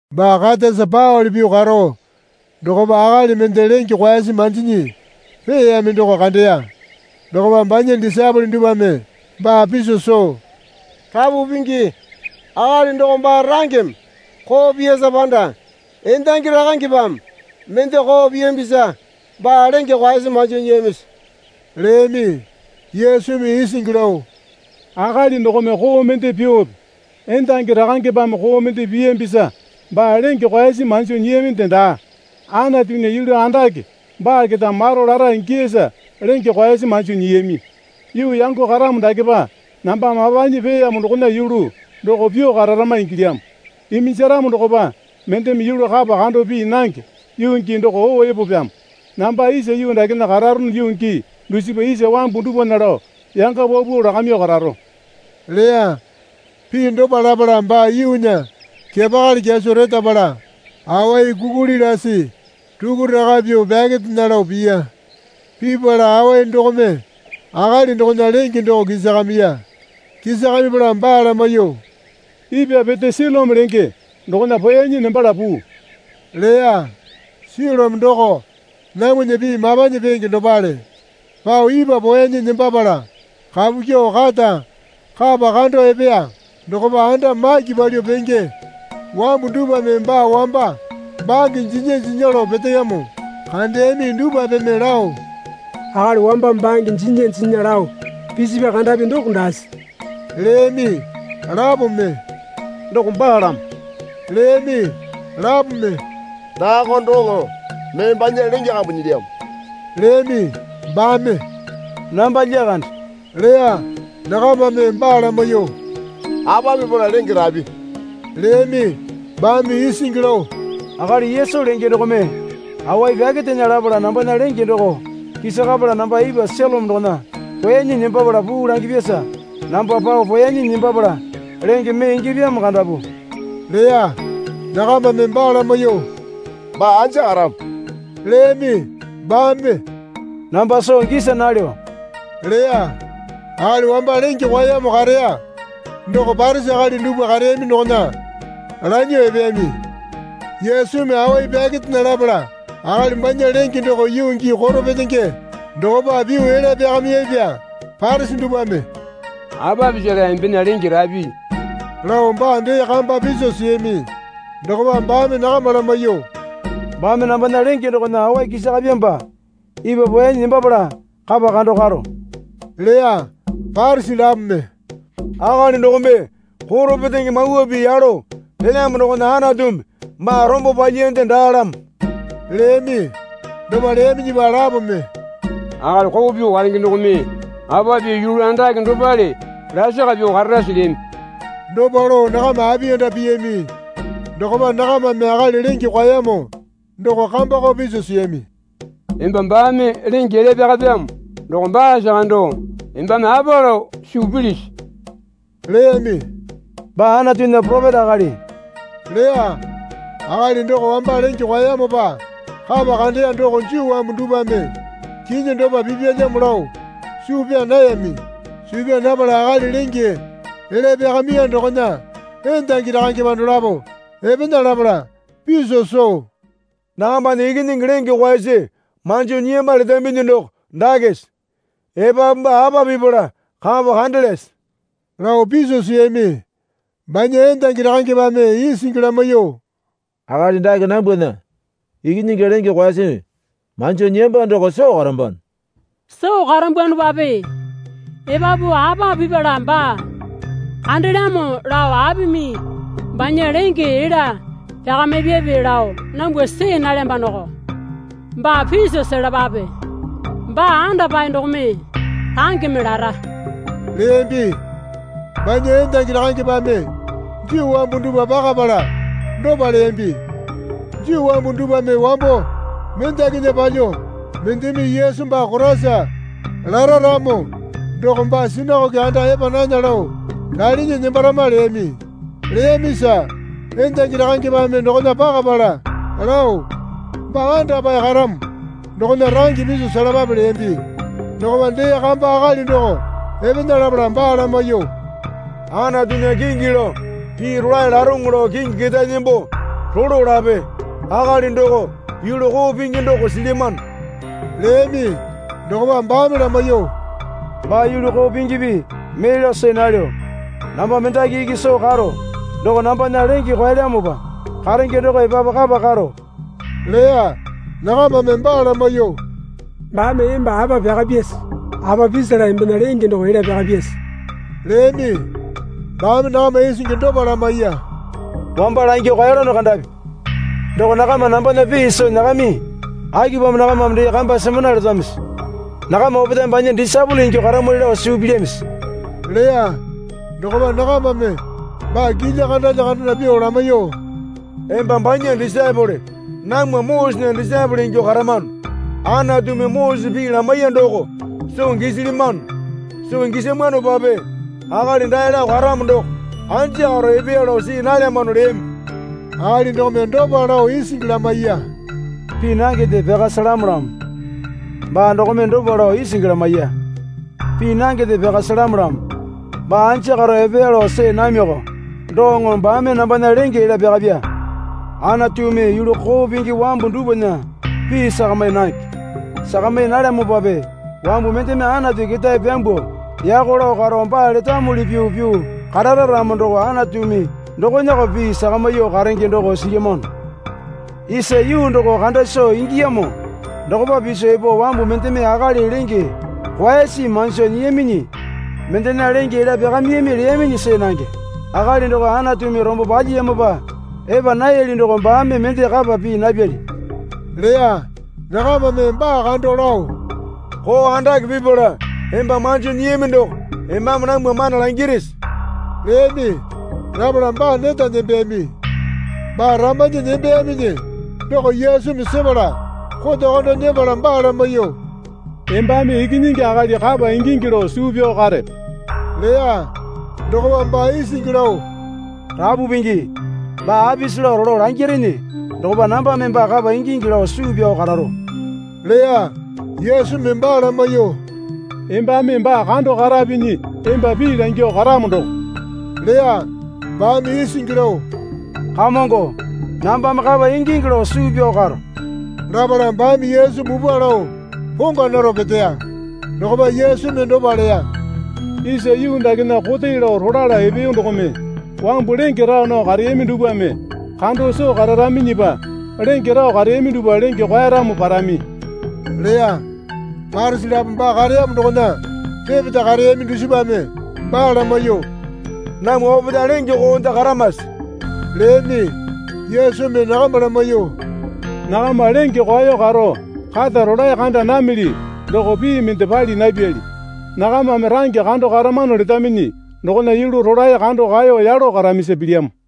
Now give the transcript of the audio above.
Baa katasa paole pyuo karo dokopa akali mende lenge kwaesi manjinyi peeyami doko kandeya. Dokopa banya disaepole dupwame baa piso soo, Rapu Pingi, akali doko baa rangeme koo piyasa panda endangi rakangepame mende koo piyambisa baa lenge kwaesi manjo nyiyamisi? leyami. Yesumi isingi lao Akali dokome koo mende pyuope endangi rakangepame koo mende piyambisa baa lenge kwaesi manjo nyiyaminde daa. Anatunya yulu andake baa keta maro lara ingiyasa lenge kwaesi manjo nyiyami. Yuu yango karamo dakepa namba mapanyi peeyamo dokona yulu doko pyuo kararama ingilyamo. Iminjaramo dokopa mendeme yulu kapa kando pii nange yuu gii doko oo epopyamo. Namba isa yuu dakena kararono yuu gii dusipa isa wambu dupwana lao yanga paupau lakamyuo kararo leya. Pii dopa lapala baa yuunya kepakali kyaso retapala awai kukuli lasi rukuraka pyuo pyakerena lao piya. Pipala awai dokome akali dokona lenge doko kisakamiya. Kisakamipala baa lamaiyuo, Ipwa pete Silome lenge dokona poeyanyi nembala puu, leya. (Silome doko namwana pii Mapanyi Peenge dopale.) Pao ipwa poeyanyi nembapala kapu kyuo kata kapa kando epeya. Dokopa anda maki palyuo penge wambu dupwame baa wamba bange jinya jinya lao peteyamo kandeyami dupwapeme lao, Akali wamba bange jinya jinya lao pisipya kandapi doko daase? leyami. Lapome, Doko baalamo leyami. Lapome, Daako doŋo mee banya lenge kambu nyilyamo leyami. Baame, Namba lyakande, leya. Nakamame baa lamaiyuo, Apa pipala lenge rapi? leyami. Baame isingi lao, Akali Yesu lenge dokome awai pyakerena lapala nambana lenge doko kisakapala namba ipwa Silome dokona poeyanyi nembapala puu langipyasa namba pao poeyanyi nembapala lenge mee ingyapyamo kandapu leya. Nakamame baa lamaiyuo, Baa anja karamo? leyami. Baame, Namba soo gisa nalyo, leya. Akali wamba lenge kwaeyamo kareya doko Parisi akali dupwa kareyami dokona lanyuo epeyami. Yesumi awai pyakerena lapala akali banya lenge doko yuu gii koro petenge dokopa pyuo elya pyakamiyapya. Parisi dupwame, Apa pisala embena lenge rapi? lao baa dee kamba piso siyami. Dokopa baame nakama lamaiyuo, Baame nambana lenge dokona awai kisakapyamopa ipwa poeyanyi nembapala kapa kando karo, leya. Parisi lapome, Akali dokome koro petenge mawa pii yalo pelyamo dokona Anatumi baa rombo palyiyande daalamo, leyami. Dopa leyaminyipa lapome, Akali koo pyuo karenge dokome apa pyuo yulu andake dopale lasaka pyuo kararase? leyami. Dopa lao nakama apiyanda piyami. Dokopa nakamame akali lenge kwaeyamo doko kambako piso siyami. Emba baame lenge elya pyakapyamo doko baasa kando embame apa lao suu pilisi? leyami. Baa Anatunya poropeta akali, leya. Akali doko wamba lenge kwaeyamopa kapa kandeya doko Juu wambu dupwame kinyi dopa pipyalyamo lao suu pyaa nayami. Suu pyaa napala akali lenge elya pyakamiya dokona endangi rakangepa dolapo epena lapala piso soo, Nakambana ikinyingi lenge kwaesi manjo nyiyamba letambinyi doko dakese? Epapu baa apa pipala kapa kandelyase? lao piso siyami. Banya endangi rakangepame isingi lamaiyuo, Akali dake nambwana ikinyingi lenge kwaesi manjo nyiyamba doko soo karambano. Soo karambwanopape epapu apa pipala baa kandelyamo lao apimi banya lenge elya pyakamipyape lao nambwa see nalyambanoko. Baa piso selapape. Baa andapae dokome rangeme lara, leyambi. Banya endangi rakangepame Juu wambu dupwa pakapala dopa leyambi. Juu wambu dupwame wambo mendakinya palyuo, Mendeme Yesu baa Koraisa, lara ramo doko baa sinakoke anda epa nana lao ralinyi nembarama leyami. Leyamisa endangi rakangepame dokona pakapala lao, Baa andapae karamo dokona range piso selapape leyambi. Dokopa dee kamba akali doko epena lapala baa lamaiyuo, Anatunya kingi lao pii rolae laroŋo lao kingi ketae nembo rolo lape. Akali doko yulu koo pingi doko silyamano leyami. Dokopa baame lamaiyuo, Baa yulu koo pingipi mee lao see nalyo. Namba mendaki iki soo karo doko, nambana lenge kwaelyamopa karenge doko epapu kapa karo leya. Nakamame baa lamaiyuo, Baame emba apa pyakapyase? Apa pisala embena lenge doko elya pyakapyase? leyami. Baame nakama isingi dopa lamaiya. Wamba langyuo kaeyalono kandapi doko nakama nambana pii soo nyakayami. Akipamo nakamame dee kamba semana letamisi? Nakama opetae banya disaepole ingyuo karamwali lao suu pilyamisi? leya. Dokopa nakamame baa kilya kandalya kandana pyuo lamaiyuo, Emba banya disaepole, namwa Mosesena disaepole ingyuo karamano. Anatumi Mosese pii lamaiya doko soo gisilyamano. Soo gisamwanopape akali dae lao karamo doko anja karo epeya lao see nalyamano leyami. Akali dokome dopa lao isingi lamaiya. Pii nangende pyaka selamolyamo. Baa dokome dopa lao isingi lamaiya. Pii nangende pyaka selamolyamo. Baa anja karo epeya lao see namiko doŋo baame nambana lenge elya pyakapya. Anatumi yulu koo pingi wambu dupwana pii sakami nange. Sakami nalyamopape wambu mendeme Anatu ketae pyambuo yako lao karo baa letamuli pyuo pyuo karara ramo doko Anatumi dokonako pii sakamyuo karenge doko silyamano. Isa yuu doko kanda soo ingiyamo dokopa piso epo wambu mendeme akali lenge kwaesi manjo nyiyaminyi mendena lenge elya pyakamiyami leyaminyi see nange. Akali doko Anatumi rombo palyiyamopa epa nayali doko baame mende kapa pii napyali leya. Nakamame baa kando lao, Koo andake pipala emba manjo nyiyami doko embame namwa mana langirisi? leyami. Lapala baa neta nembeyami. Baa ramanyi nembeyaminyi doko Yesumi sepala koto kando nyepala baa lamaiyuo, Embame Ikinyingi Akali kapa ingingi lao suu pyao karepe? leya. Dokopa baa isingi lao, Rapu Pingi baa apisi lao rolo langyarene dokopa nambame baa kapa ingingi lao suu pyao kararo, leya. Yesumi baa lamaiyuo, Embame baa kando karapinyi emba pii langyuo karamo doko leya. Baame isingi lao, Kamongo, nambame kapa ingingi lao suu pyao karo, lapala baame Yesu mupwa lao pongwa naro peteya. Dokopa Yesumi dopa leya. Isa yuu dakena kote lao rolala epeyo dokome wambu lenge raa nao kareyami dupwame kando soo kararaminyipa lenge rao kareyami dupwa lenge kwaeramo parami leya. Parisi lapo baa kareyamo dokona repeta kareyami dusipame baa lamaiyuo, Namwa opetae lenge koonde karamase? leyami. Yesumi nakama lamaiyuo, Nakama lenge kwao karo kata rolae kanda namili doko pii mende pali napyali. Nakamame range kando karamano letaminyi dokona yulu rolae kando kaeyo yalo karamisa pilyamo.